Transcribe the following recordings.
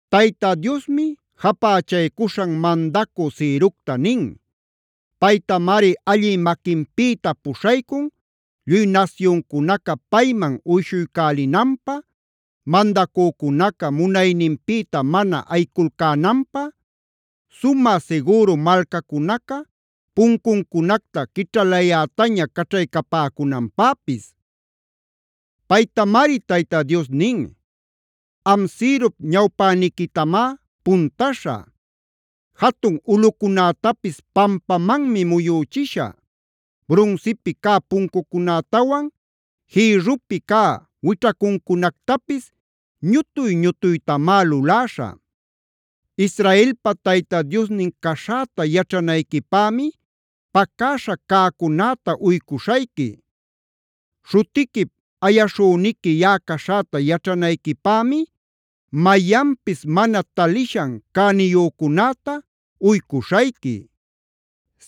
Tayta Diosmi japächaycuśhan mandacü Cirocta nin. Paytamari allï maquinpïta puśhaycun lluy nasyuncunaca payman uyshuycälinanpä, mandacücunaca munayninpïta mana ayiculcänanpä, sumä sigüru malcacunaca puncuncunacta quićhalayätaña caćhaycapäcunanpäpis. Paytamari Tayta Dios nin: “Am Cirop ñawpäniquitamá puntaśhä; jatun ulꞌucunätapis pampamanmi muyuchishä; brunsipi cä puncucunätawan jïrrupi cä wićhacuncunactapis ñutuy-ñutuytamá luläśhä. Israelpa Tayta Diosnin caśhäta yaćhanayquipämi pacäśha cäcunäta uycuśhayqui. Śhutiquip ayaśhüniqui yaꞌa caśhäta yaćhanayquipämi mayanpis mana talishan cäniyücunäta uycuśhayqui.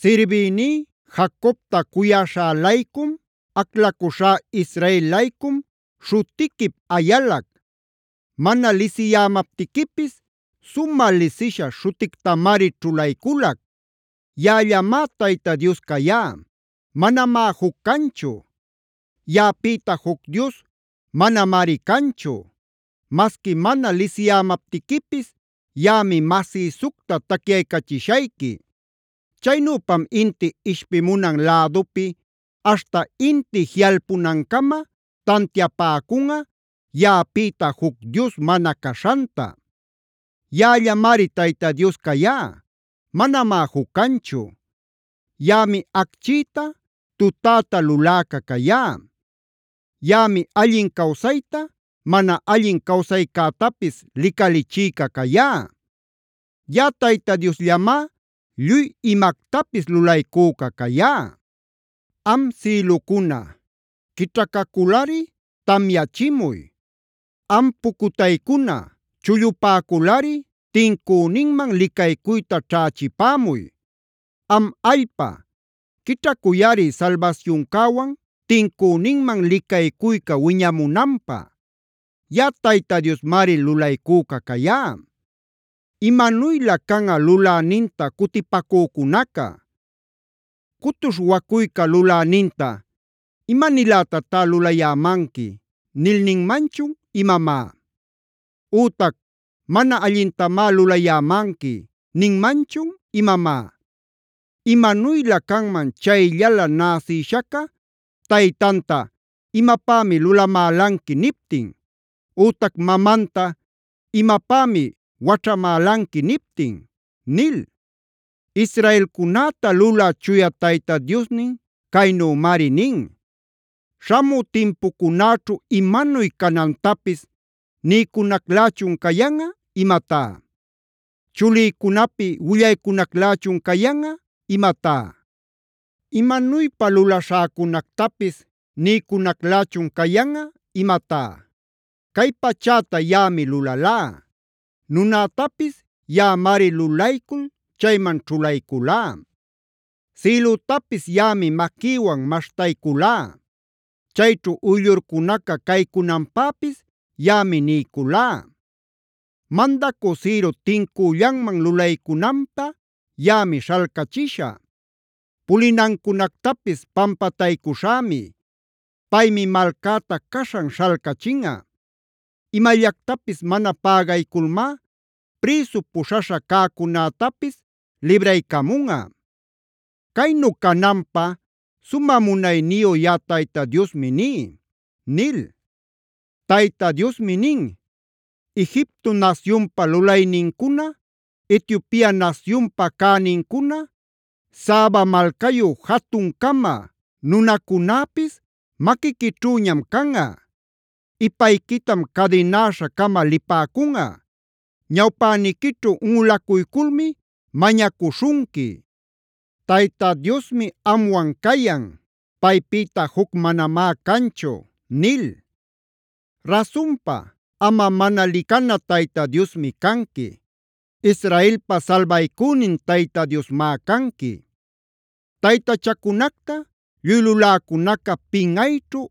“Sirbïní Jacobta cuyaśhä-laycum, aclacuśhá Israel-laycum śhutiquip ayalac; mana lisiyämaptiquipis sumä lisisha śhutictamari ćhulayculac. Yaꞌallamá Tayta Dios cayá; manamá juc canchu. Yaꞌapïta juc dios manamari canchu. Masqui mana lisiyämaptiquipis yaꞌami masïsucta tacyaycachishayqui. Chaynüpam inti ishpimunan lädupi aśhta inti jiꞌalpunancama tantiapäcunꞌa yaꞌapïta juc dios mana caśhanta. Yaꞌallamari Tayta Dios cayá; manamá juc canchu. Yaꞌami acchïta, tutäta luläca cayá; yaꞌami allin cawsayta, mana allin cawsaycätapis licalichïca cayá. Yaꞌa Tayta Diosllamá lluy imactapis lulaycüca cayá. “Am sïlucuna, quićhacaculꞌari tamyachimuy. Am pucutaycuna, chullupäculꞌari tincüninman licaycuyta ćhächipämuy. Am allpa, quićhacuyꞌari salbasyuncäwan tincüninman licaycuyca wiñamunanpä. Yaꞌa Tayta Diosmari lulaycüca cayá. “¡Imanuylä canꞌa luläninta cutipacücunaca! ¿Cutuśh wacuyca luläninta: ‘¿Ima-nilätatá lulayämanqui?’a nil ninmanchun imamá? Ütac: ‘¿Mana allintamá lulayämanqui’ ninmanchun imamá? Imanuylä canman chayllala näsïshaca taytanta: ‘¿Imapämi lulamälanqui?’ niptin. Ütac mamanta: ‘¿Imapämi waćhamälanqui?’ niptin” nil. Israelcunäta lulä Chuya Tayta Diosnin caynümari nin: “¿Śhamü timpucunäćhu imanuy canantapis niycunaclächun cayanꞌa imatá? ¿Chulïcunapi willaycunaclächun cayanꞌa imatá? ¿Imanuypa lulaśhäcunactapis niycunaclächun cayanꞌa imatá? Cay pachäta yaꞌami lulalá; nunätapis yaꞌamari lulaycul chayman ćhulayculá. Sïlütapis yaꞌami maquïwan maśhtayculá; chayćhu uyllurcunaca caycunanpäpis yaꞌami niyculá. Mandacü Ciro tincüllanman lulaycunanpä yaꞌami śhalcachishä; pulinancunactapis pampataycuśhämi. Paymi malcäta caśhan śhalcachinꞌa; imallactapis mana pägayculmá prïsu puśhaśha cäcunätapis libraycamunꞌa. Caynu cananpä sumä munayniyu yaꞌa Tayta Diosmi ní” nil. Tayta Diosmi nin: “Egipto nasyunpa lulaynincuna, Etiopia nasyunpa cänincuna, Saba malcayu jatun-cama nunacunäpis maquiquićhüñam canꞌa. Ipayquitam cadinäśha-cama lipäcunꞌa; ñawpäniquićhu unꞌulacuyculmi mañacuśhunqui: ‘Tayta Diosmi amwan cayan; paypïta juc manamá canchu’” nil. Rasunpa, amꞌa mana licana Tayta Diosmi canqui; Israelpa salbaycünin Tayta Diosmá canqui. Taytachacunacta lluy luläcunaca pinꞌayćhu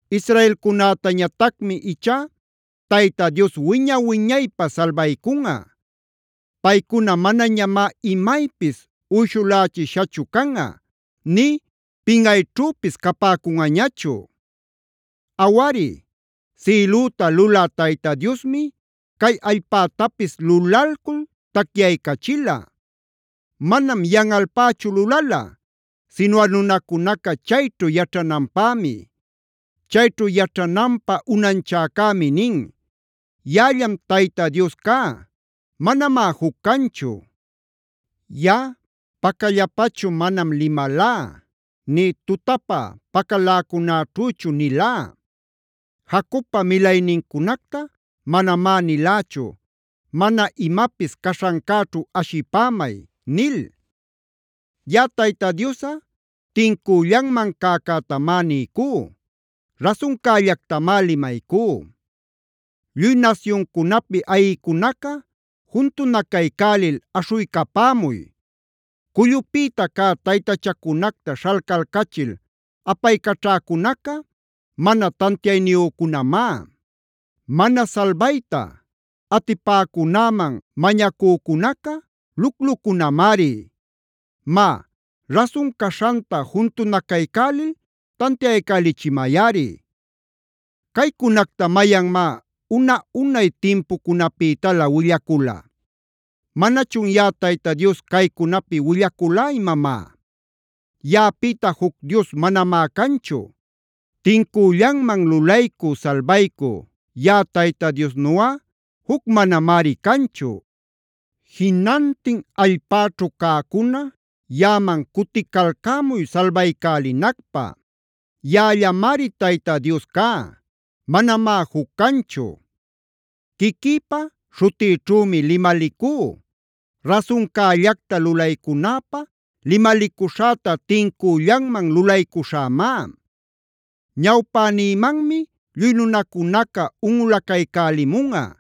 Israelcunätañatacmi ichá Tayta Dios wiña-wiñaypä salbaycunꞌa. Paycuna manañamá imaypis uyshulächishachu canꞌa nï pinꞌayćhüpis capäcunꞌañachu. Awari, sïlüta lulä Tayta Diosmi cay allpätapis lulalcul tacyaycachila. Manam yanꞌalpächu lulala, sinuꞌa nunacunaca chayćhu yaćhananpämi. Chayćhu yaćhananpä unanchäcämi nin: “Yaꞌallam Tayta Dios cá; manamá juc canchu. Yaꞌa pacallapachu manam limalá, nï tutapä pacaläcunaćhüchu nilá. Jacobpa milaynincunacta manamá nilächu: ‘Mana imapis caśhancäćhu ashipämay’ nil. Yaꞌa Tayta Diosꞌa tincüllanman cäcätamá niycú; rasuncällactamá limaycú. “Lluy nasyuncunapi ayïcunaca juntunacaycälil aśhuycapämuy. Cullupïta cä taytachacunacta śhalcalcachil apaycaćhäcunaca mana tantiayniyücunamá; mana salbayta atipäcunäman mañacücunaca luclucunamari. Má, rasun caśhanta juntunacaycälil tantiaycälichimayꞌari. ¿Caycunacta mayanmá una-unay timpucunapïtalä willacula? ¿Manachun yaꞌa Tayta Dios caycunapi willaculá imamá? Yaꞌapïta juc dios manamá canchu. Tincüllanman lulaycü, salbaycü yaꞌa Tayta Diosnuꞌa juc manamari canchu. “Jinantin allpäćhu cäcuna yaꞌaman cuticalcämuy salbaycälinacpä. Yaꞌallamari Tayta Dios cá; manamá juc canchu. Quiquïpa śhutïćhümi limalicú; rasuncällacta lulaycunäpä limalicuśhäta tincüllanman lulaycuśhämá: ‘Ñawpänïmanmi lluy nunacunaca unꞌulaycälimunꞌa;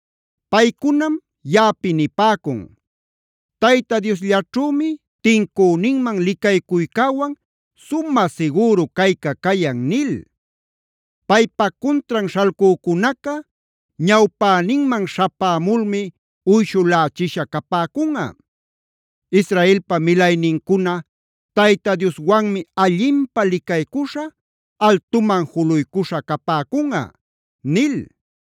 “Paycunam yaꞌapi nipäcun: ‘Tayta Diosllaćhümi tincüninman licaycuycäwan sumä sigüru cayca cayan’ nil. Paypa cuntran śhalcücunaca ñawpäninman śhapämulmi uyshulächisha capäcunꞌa. Israelpa milaynincuna Tayta Dioswanmi allinpä licaycuśha, altuman juluycuśha capäcunꞌa” nil.